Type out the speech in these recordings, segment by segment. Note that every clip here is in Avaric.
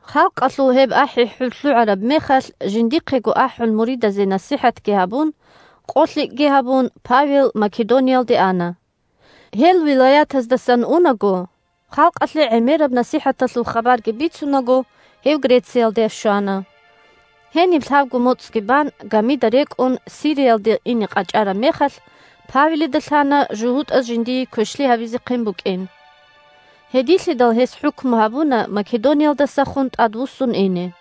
Халкъалъул гьеб ахӀи-хӀур лъугӀараб мехалъ, жиндихъего ахӀун муридазе насихӀатги гьабун, къолъикӀги гьабун, Павел Македониялде ана. Гьел вилаятаздасан унаго, халкъалъе гӀемераб насихӀаталъул хабарги бицунаго, гьев Грециялде щвана. Гьениб лъабго моцӀги бан, гамида рекӀун, Сириялде ине къачӀараб мехалъ, Павелида лъана жугьутӀаз жиндие квешлъи гьабизехъин букӀин. Гьединлъидал гьес хӀукму гьабуна Македониялдасахун тӀадвуссун ине.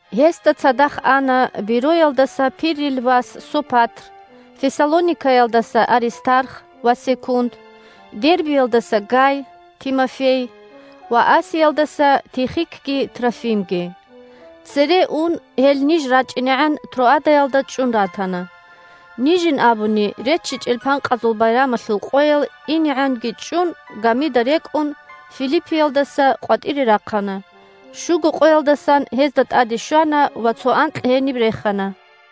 Гьесда цадахъ ана Бероялдаса Пиррил вас Сопатр, Фессалоникаялдаса Аристарх ва Секунд, Дербиялдаса Гай, Тимофей ва Асиялдаса Тихикги Трофимги. Цере ун гьел ниж рачӀинегӀан Троадаялда чӀун ратана. Нижин абуни, РеччичӀел Панкъазул Байрамалъул къоял инегӀанги чӀун, гамида рекӀун Филиппиялдаса къватӀире рахъана, щуго къоялдасан гьезда тӀаде щвана ва цо анкь гьениб рехана.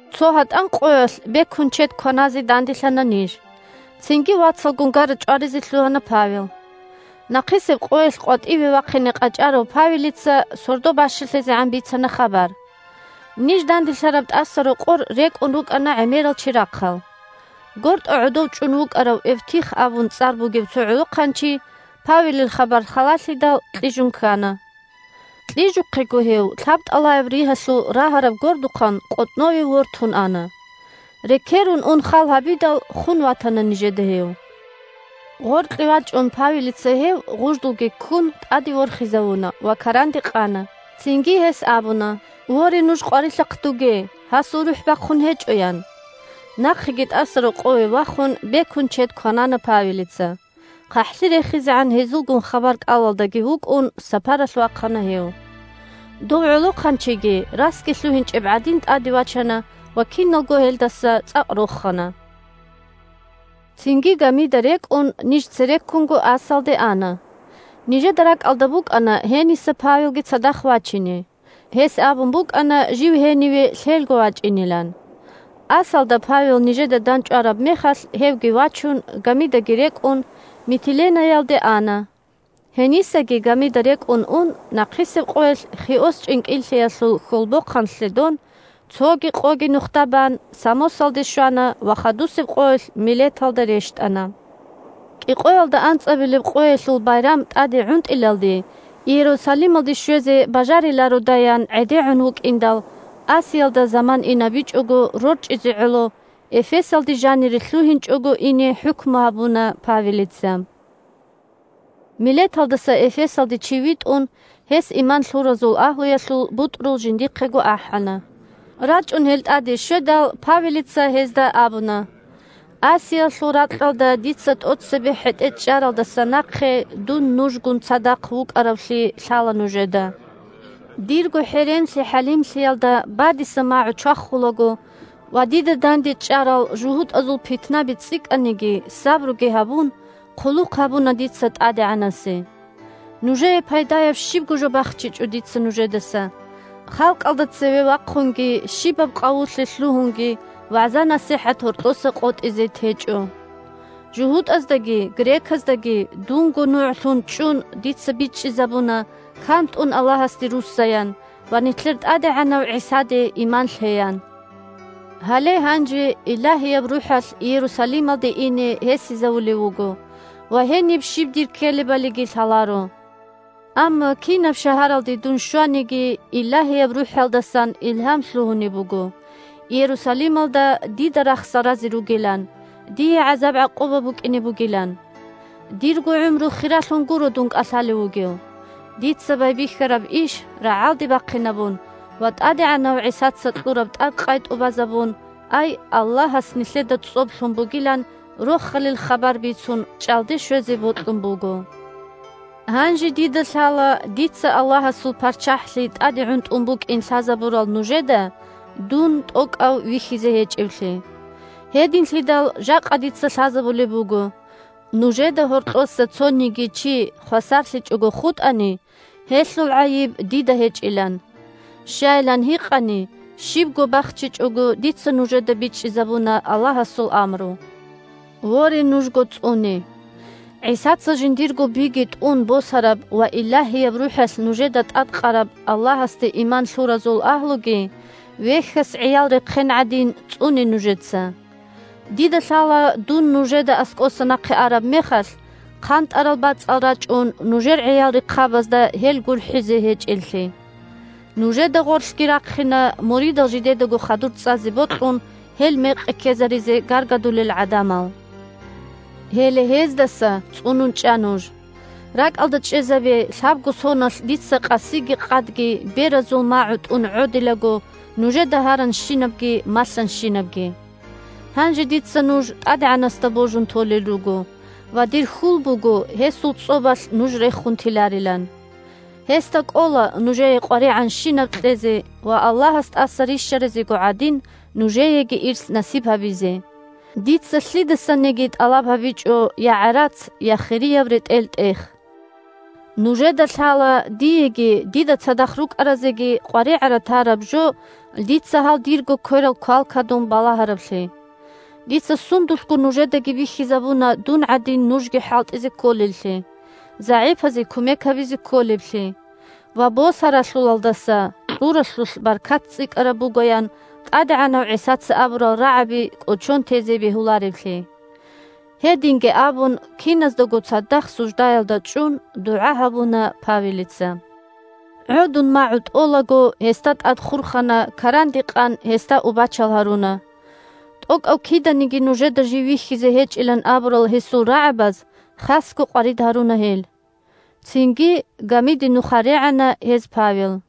Цо гьатӀан къоялъ бекун чед кваназе данделъана ниж, цинги вацалгун гара-чӀваризе лъугьана Павел. Нахъисеб къоялъ къватӀиве вахъине къачӀарав Павелица сордо бащалъизегӀан бицана хабар. Ниж данделъараб тӀасарокъор рекӀун рукӀана гӀемерал чирахъал. ГортӀа гӀодов чӀун вукӀарав Эвтих абун цӀар бугев цо гӀолохъанчи, Павелил хабар халалъидал, кьижун ккана. Кьижухъего гьев лъабтӀалаяб ригьалъул рагьараб гордухъан къотӀнове вортун ана. Рекерун ун хал гьабидал, хун ватана нижеда гьев. Гъоркье вачӀун Павелица гьев, гъуждулги ккун, тӀаде ворхизавуна ва каранде къана. Цинги гьес абуна: – Воре, нуж къварилъахъдуге, гьасул рухӀ бахъун гьечӀо, – ян. Нахъеги тӀасарокъове вахун, бекун чед кванана Павелица, хъахӀлъи рехизегӀан гьезулгун хабар-кӀалалдаги вукӀун, сапаралъ вахъана гьев. Дов гӀолохъанчиги, расги лъугьинчӀеб гӀадин, тӀаде вачана ва киналго гьелдаса цӀакъ рохана. Цинги, гамида рекӀун, ниж цереккунго Ассалде ана. Нижеда ракӀалда букӀана гьениса Павелги цадахъ вачине, гьес абун букӀана жив гьениве лъелго вачӀинилан. Ассалда Павел нижеда дандчӀвараб мехалъ, гьевги вачун, гамидаги рекӀун, Митиленаялде ана. Гьенисаги гамида рекӀун ун, нахъисеб къоялъ Хиос чӀинкӀиллъиялъул хьолбохъан лъедон, цоги къоги нухда бан, Самосалде щвана ва хадусеб къоялъ Милеталда рещтӀана. КӀикъоялда анцӀабилеб къоялъул байрам тӀаде гӀунтӀилалде Иерусалималде щвезе бажарилародаян гӀедегӀун вукӀиндал, Асиялда заман инабичӀого рорчӀизе гӀоло, Эфесалде жанире лъугьинчӀого ине хӀукму гьабуна Павелица. Милеталдаса Эфесалде чи витӀун, гьес иман лъуразул агьлуялъул бутӀрул жиндихъего ахӀана. РачӀун гьел тӀаде щведал, Павелица гьезда абуна: – Асиялъул ракьалда дица тӀоцебе хӀетӀе чӀаралдаса нахъе дун нужгун цадахъ вукӀаравлъи лъала нужеда. Дирго хӀеренлъи-хӀалимлъиялда бадиса магӀу чвахулаго ва, дида дандечӀарал жугьутӀазул питнаби цӀикӀкӀаниги сабруги гьабун, хъулухъ гьабуна дица ТӀадегӀанасе. Нужее пайдаяб щибго жо бахчичӀо дица нужедаса: халкъалда цеве вахъунги щибаб къавулъе лъугьунги вагӀза-насихӀат гьоркьоса къотӀизе течӀо. ЖугьутӀаздаги греказдаги, дунго нугӀлъун чӀун, дица бичӀчӀизабуна кантӀун Аллагьасде руссаян ва нилъер ТӀадегӀанав ГӀисаде иман лъеян. Гьале гьанже Илагьияб РухӀалъ Иерусалималде ине гьесизавулев вуго ва гьениб щиб дир ккелебалиги лъаларо. Амма кинаб шагьаралде дун щваниги, Илагьияб РухӀалдасан илгьам лъугьунеб буго Иерусалималда дида рахсал разе ругилан, дие гӀазаб-гӀакъуба букӀине бугилан. Дирго гӀумру хиралъун гуро дун кӀалъалев вугев. Дица байбихьараб иш рагӀалде бахъинабун ва ТӀадегӀанав ГӀисаца кьураб тӀадкъай тӀубазабун, ай Аллагьас нилъеда цӀоб лъун бугилан Рохалил хабар бицун чӀалде щвезе бокьун буго. Гьанже дида лъала дица Аллагьасул ПарччахӀлъи тӀаде гӀунтӀун букӀин лъазабурал нужеда дун тӀокӀав вихьизе гьечӀевлъи. Гьединлъидал жакъа дица лъазабулеб буго, нужеда гьоркьоса цониги чи хвасарлъичӀого хутӀани, гьелъул гӀайиб дида гьечӀилан. Щайилан гьикъани, щибго бахчичӀого дица нужеда бичӀчӀизабуна Аллагьасул амру. Воре, нужго цӀуне! ГӀисаца жиндирго биги тӀун босараб ва Илагьияб РухӀалъ нужеда тӀадкъараб Аллагьасде иман лъуразул агьлуги, вехьас гӀиял рехъен гӀадин, цӀуне нужеца. Дида лъала дун нужеда аскӀоса нахъе араб мехалъ, хъантӀарал бацӀал рачӀун, нужер гӀиял рехъабазда гьел гурхӀизе гьечӀеллъи. Нужеда гъорлъги рахъина, муридал жидедаго хадур цӀазе бокьун, гьел мекъи ккезаризе гаргадулел гӀадамал. Гьеле гьездаса цӀунун чӀа нуж. РакӀалда чӀезабе лъабго соналъ дица къасиги къадги беразул магӀу тӀун гӀодилаго нужеда гьаранщинабги малъанщинабги. Гьанже дица нуж ТӀадегӀанасда божун толел руго ва дир хьул буго гьесул цӀобалъ нуж рехун теларилан. Гьесда кӀола нужее къваригӀанщинаб кьезе ва, Аллагьас тӀаса рищаразего гӀадин, нужееги ирс насиб гьабизе. Дица лъидасаниги тӀалаб гьабичӀо я гӀарац, я хирияб ретӀел-тӀех. Нужеда лъала диеги дида цадахъ рукӀаразеги къваригӀара-тараб жо дица гьал дирго кверал квалквадун балагьараблъи. Дица сундулъго нужедаги бихьизабуна дун гӀадин нужги хӀалтӀизе кколеллъи, загӀипазе кумек гьабизе кколеблъи ва «Босаралъулъалдаса кьуралъулъ баркат цӀикӀкӀараб буго», – ян ТӀадегӀанав ГӀисаца абурал рагӀаби кӀочон тезе бегьулареблъи. Гьединги абун, киназдаго цадахъ суждаялда чӀун, дугӀа гьабуна Павелица. ГӀодун магӀу тӀолаго, гьесда тӀад хурхана, каранде къан, гьесда убачал гьаруна. ТӀокӀав киданиги нужеда жив вихьизе гьечӀилан абурал гьесул рагӀабаз хасго къварид гьаруна гьел. Цинги гамиде нуха регӀана гьез Павел.